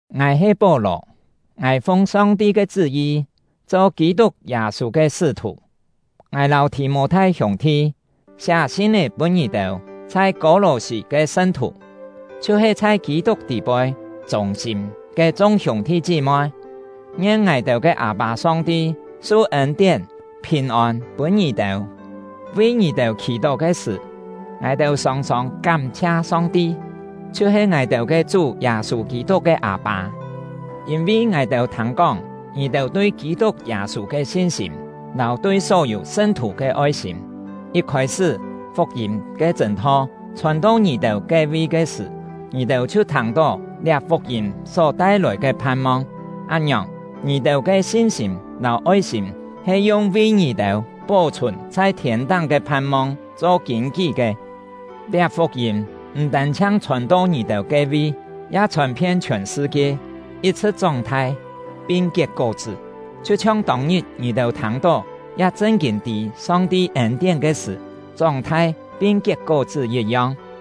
Ngài he Pó-lò; ngài fung Song-ti ke chṳ́-yi cho Kî-tuk Yâ-sû ke sṳ́-thù. Ngài lâu Thì-mô-thai hiûng-thi siá sin-é pûn ngì-têu chhai Kô-lò-sî ke sṳn-thù, chhiu-he chhai Kî-tuk tî-poi chûng-sîm ke chung hiûng-thi chí-moi. Ngien ngài-têu ke Â-pâ Song-ti su ên-tién, phìn-ôn pûn ngì-têu! Vi ngì-têu khì-tó ke sṳ̀, ngài-têu sòng-sòng kám-chhia Song-ti, chhiu-he ngài-têu ke Chú Yâ-sû Kî-tuk ke Â-pâ; yîn-vi ngài-têu thâng-kóng ngì-têu tui Kî-tuk Yâ-sû ke sin-sîm, lâu tui só-yû sṳn-thù ke oi-sîm. Yit khôi-sṳ́, fuk-yîm ke chṳ̂n-tho chhòn-to ngì-têu ke-vi ke sṳ̀, ngì-têu chhiu thâng-tó liá fuk-yîm só tai-lòi ke phan-mong. Án-ngiòng, ngì-têu ke sin-sîm lâu oi-sîm he yung vi ngì-têu pó-chhùn chhai thiên-táng ke phan-mong cho kîn-kí ke. Liá fuk-yîm m̀ tân-chhiang chhòn-to ngì-têu ke-vi, ya chhòn-phien chhiòn sṳ-kie, yit-chhṳ̍t chóng-thai pin kiet kó-chṳ́, chhiu-chhiong tông-ngit ngì-têu thâng-tó ya chṳn-kîn tî Song-ti ên-tién ke sṳ̀, chóng-thai pin kiet kó-chṳ́ yit-yong.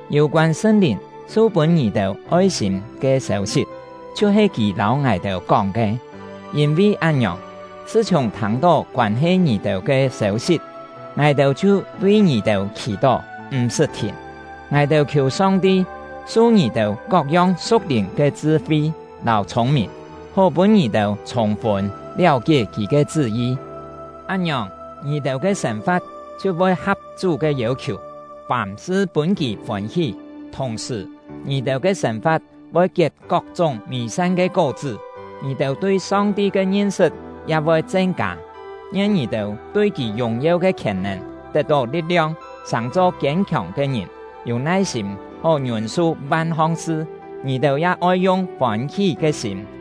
Yû-koân Sṳn-Lìn su-pûn ngì-têu oi-sîm ke sêu-sit chhiu-he kì lâu ngài-têu kóng ke. Yîn-vi án-ngiòng, chhṳ-chhiùng thâng-tó koân-he ngì-têu ke sêu-sit, ngài-têu chhiu vi ngì-têu khì-tó, m̀-sṳt thìn. Ngài-têu khiù Song-ti su ngì-têu kok-yong su̍k-lìn ke chṳ-fi lâu chhûng-mìn, hó pûn ngì-têu chhûng-fûn liáu-kié Kì ke chṳ́-yi. Án-ngiòng, ngì-têu ke sên-fa̍t chhiu voi ha̍p Chú ke yêu-khiù, fàm-sṳ pûn kì fôn-hí. Thùng-sṳ̀, ngì-têu ke sên-fa̍t voi kiet kok-chúng mî-san ke kó-chṳ́, ngì-têu tui Song-ti ke ngin-sṳt ya voi chen-kâ. Ngien ngì-têu tui Kì yùng-yeu ke khièn-nèn tet-tó li̍t-liong, sàng-cho kiên-khiòng ke ngìn, yû nai-sîm hó ngiûn-su van-hong sṳ. Ngì-têu ya oi yung fôn-hí ke sîm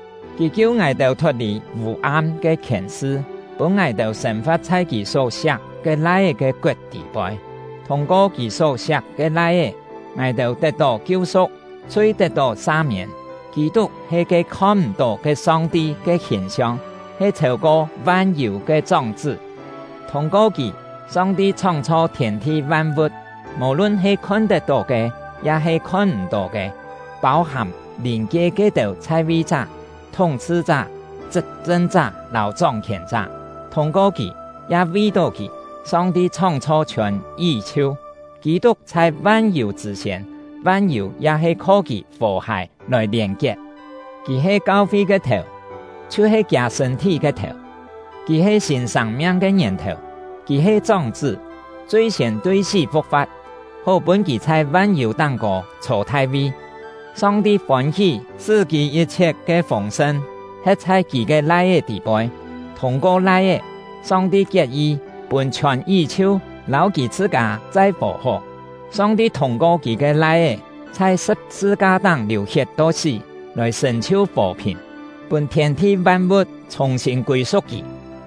Kì kiu ngài-têu thot-lì vû-am ke khièn-sṳ, pûn ngài-têu sên-fa̍t chhai Kì só-siak ke Lai-é ke koet tî-poi. Thûng-ko Kì só-siak ke Lai-é, ngài-têu tet-tó kiu-su̍k, chhui tet-tó sa-miên. Kî-tuk he ke khon-m̀-tó ke Song-ti ke hìn-siong, he chhêu-ko van-yû ke chóng-chṳ́. Thûng-ko kì, Song-ti chhóng-chho thiên-thi van-vu̍t, mò-lun he khon-tet-tó ke ya-he khon-m̀-tó ke, pâu-hàm lìn-kie ke-têu chhai-vi-chá, thúng-chhṳ-chá, chṳp-chṳn-chá, lâu chóng-khièn-chá. Thûng-ko kì, ya vi-tó kì, Song-ti chhóng-chho chhiòn yí-chhiu. Kî-tuk chhai van-yû chṳ̂ siên; van-yû ya he kho kì fò-hài lòi lièn-kiet. Kì he kau-fi ke thèu, chhiu-he kiâ sṳ̂n-thí ke thèu; kì he sîn sâng-miang ke ngièn-thèu. Kì he chóng-chṳ́, chui-siên tui sí fu̍k-fa̍t, hó pûn kì chhai van-yû táng-kô chhô thai-vi. Song-ti fôn-hí sṳ́ Kì yit-chhiet ke fûng-sṳn he̍t chhai Kì ke Lai-é tî-poi. Thûng-ko Lai-é, Song-ti kiet-yi pûn chhiòn yí-chhiu lâu Kì chhṳ-kâ chai fò-hó. Song-ti thûng-ko Kì ke Lai-é chhai sṳ̍p-sṳ-ka-táng liù-hiet to sí lòi sṳ̀n-chhiu fò-phìn, pûn thiên-thi van-vu̍t chhùng-sîn kûi-su̍k Kì.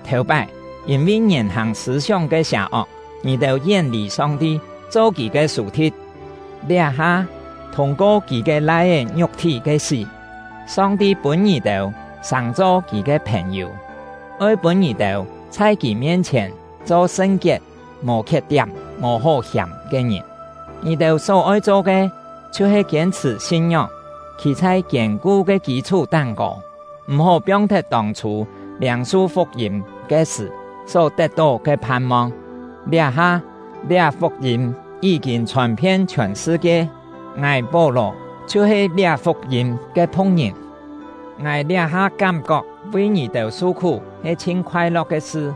Thèu-pái, yîn-vi ngièn-hàng sṳ̂-sióng ke sià-ok, ngì-têu yén-lì Song-ti, cho Kì ke sù-thi̍t. Liá-ha, thûng-ko Kì ke Lai-é ngiuk-thí ke sí, Song-ti pûn ngì-têu sàng-cho Kì ke phèn-yû, oi pûn ngì-têu chhai Kì mien-chhièn cho sṳn-kiet, mò khiet-tiám, mò hó hiàm ke ngìn. Ngì-têu só-oi cho ke, chhiu-he kiên-chhṳ̀ sin-ngióng, khî chhai kiên-ku ke kî-chhú táng-kô; m̀-hó piong-thet tông-chhû liâng-su fuk-yîm ke sṳ̀ só tet-tó ke phan-mong. Liá-ha, liá fuk-yîm yí-kîn chhòn-phien chhiòn sṳ-kie; ngài — Pó-lò chhiu-he liá fuk-yîm ke phu̍k-ngìn. Ngài liá-ha kám-kok vi ngì-têu su-khú he chhin khoai-lo̍k ke sṳ;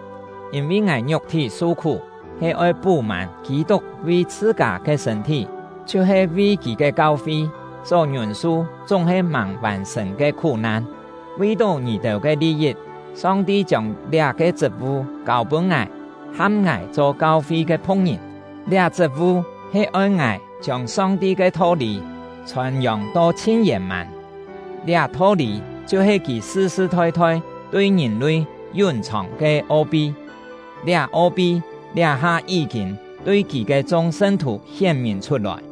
yîn-vi ngài ngiuk-thí su-khú, he oi pú-mân Kî-tuk vi chhṳ-kâ ke sṳ̂n-thí — chhiu-he vi kì ke kau-fi, só ngiûn-su chúng-he màng vàn-sṳ̀n ke khú-nan. Vi-tó ngì-têu ke li-yit, Song-ti chiông liá-ke chṳt-vu kâu-pûn ngài, ham ngài cho kau-fi ke phu̍k-ngìn. Liá chṳt-vu he oi ngài chiông Song-ti ke tho-lî chhòn-yòng to chhin yèn-mân; liá tho-lî chhiu-he Kì sṳ-sṳ thoi-thoi tui ngìn-lui yún-chhòng ke o-pi; liá o-pi liá-ha yí-kîn tui Kì ke chung sṳn-thù hién-mìn chhut-lòi.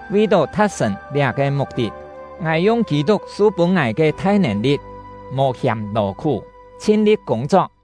Vi-tó tha̍t-sṳ̀n liá-ke muk-tit, ngài yung Kî-tuk su-pûn ngài ke thai nèn-li̍t, mò hiàm lò-khú, chhin-li̍t kûng-chok.